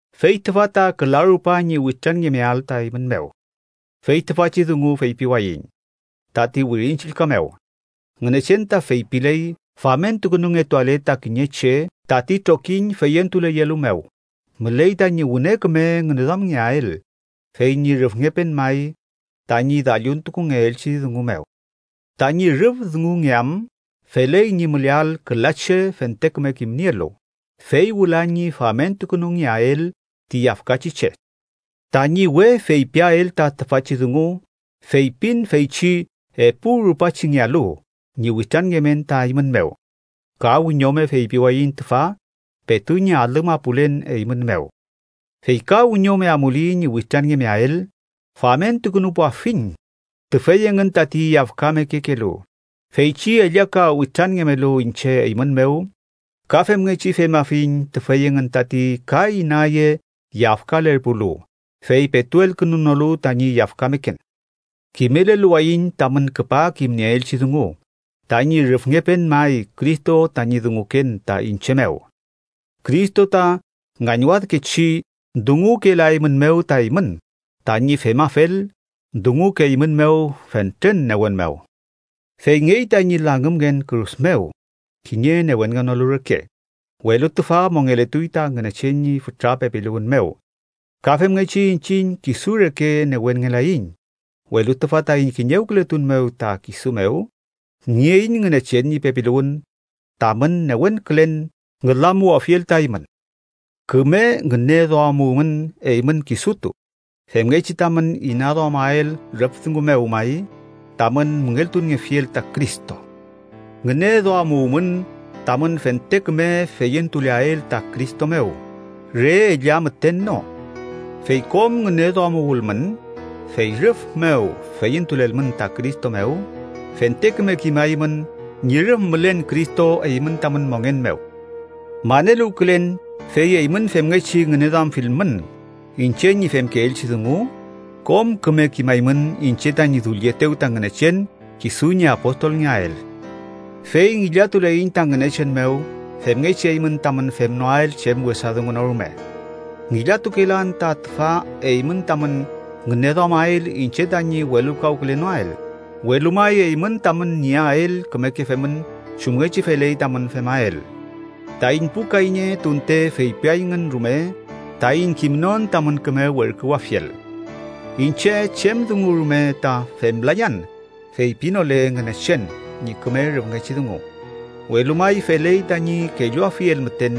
Fey tüfa ta küla rupa ñi witranngemeael ta eymün mew. Fey tüfachi dungu feypiwayiñ, tati Wirin Chillka mew Ngünechen ta feypiley famentukünungetuale ta kiñe che tati trokiñ feyentuleyelu mew, müley tañi wüne küme ngüneduamngeael fey ñi rüfngepen may tañi dalluntukungeelchi dungu mew. “Tañi rüf dungungeam feley ñi müleael küla che fente küme kimnielu”, fey wüla ñi famentukünungeael ti yafkachi che. Tañi we feypiael ta tüfachi dungu feypin feychi epu rupachingealu ñi witranngemen ta eymün mew. Ka wiñome feypiwayiñ tüfa petu ñi alü mapulen eymün mew. Fey ka wiñome amuli ñi witranngemeael, famentukünupuafiñ tüfey engün tati yafkamekekelu feychi ellaka witranngemelu iñche eymün mew. Ka femngechi femafiñ tüfey engün tati ka inaye yafkalerpulu, fey petu elkünunolu tañi yafkameken. Kimeleluwayiñ tamün küpa kimnieelchi dungu tañi rüfngepen may Cristo tañi dunguken ta iñche mew. Cristo ta ngañwadkechi dungukelaeymünmew ta eymün, tañi femafel, dungukeeymünmew fentren newen mew. Feyngey tañi langümngen kürus mew kiñe newenngenolu reke, welu tüfa mongeletuy ta Ngünechen ñi fütra pepiluwün mew. Ka femngechi iñchiñ kisu reke, newenngelaiñ, welu tüfa taiñ kiñewkületun mew ta kisu mew, nieiñ Ngünechen ñi pepiluwün tamün newenkülen ngülamuwafiel ta eymün. Küme ngüneduamuwmün eymün kisutu, femngechi tamün inaduamael rüf dungu mew may tamün müngeltuniefiel ta Cristo. Ngüneduamuwmün tamün fente küme feyentuleael ta Cristo mew re ella müten no. Fey kom ngüneduamuwülmün, fey rüf mew feyentulelmün ta Cristo mew, fente küme kimaymün ñi rüf mülen Cristo eymün tamün mongen mew. Maneluwkülen, fey eymün femngechi ngüneduamfilmün iñche ñi femkeelchi dungu, kom küme kimaymün iñche tañi dullietew ta Ngünechen kisu ñi apostolngeael. Fey ngillatuleiñ ta Ngünechen mew femngechi eymün tamün femnoael chem wesa dungu no rume. Ngillatukelan ta tüfa eymün tamün ngüneduamael iñche tañi welulkawkülenoael, welu may eymün tamün nieael kümeke femün chumngechi feley tamün femael, taiñ pu kayñe tunte feypiayngün rume taiñ kimnon tamün küme werküwafiel. Iñche chem dungu rume ta femlayan feypilenole Ngünechen ñi küme rüfngechi dungu, welu may feley tañi kelluafiel müten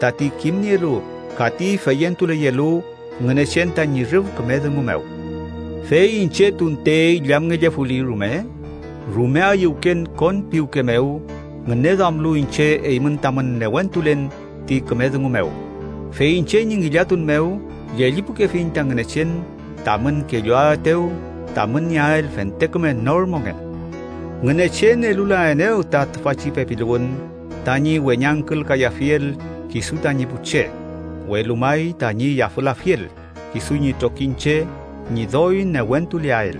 tati kimnielu ka ti feyentuleyelu Ngünechen tañi rüf küme dungu mew. Fey iñche tunte illamngellefuli rume, rume ayüwken kon piwke mew ngüneduamlu iñche eymün tamün newentulen ti küme dungu mew. Fey iñche ñi ngillatun mew, llellipukefiñ ta Ngünechen tamün kelluaetew tamün nieael fente küme nor mongen. Ngünechen elulaenew ta tüfachi pepiluwün tañi weñangkülkayafiel kisu tañi pu che, welu may tañi yafülafiel kisu ñi trokiñche ñi doy newentuleael.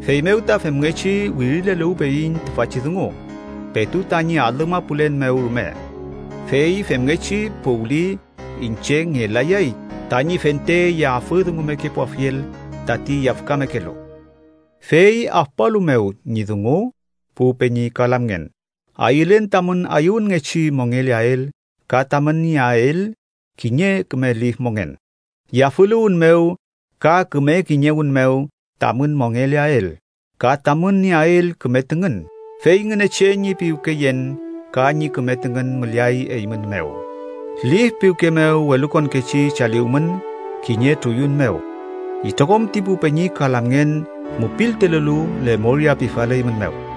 Feymew ta femngechi wirileluwpeyiñ tüfachi dungu, petu tañi alü mapulen mew rume, fey femngechi puwli iñche ngelayay tañi fente yafüdungumekepuafiel tati yafkamekelu. Fey afpualu mew ñi dungu, pu peñi ka lamngen, ayülen tamün ayüwünngechi mongeleael ka tamün nieael kiñe küme lif mongen. Yafüluwün mew ka küme kiñewün mew tamün mongeleael ka tamün nieael küme tüngün, fey Ngünechen ñi piwkeyen ka ñi küme tüngün müleay eymün mew. Lif piwke mew welukonkechi chaliwmün kiñe truyun mew. Itrokom ti pu peñi ka lamngen mupiltulelu lemoria pifaleymünmew.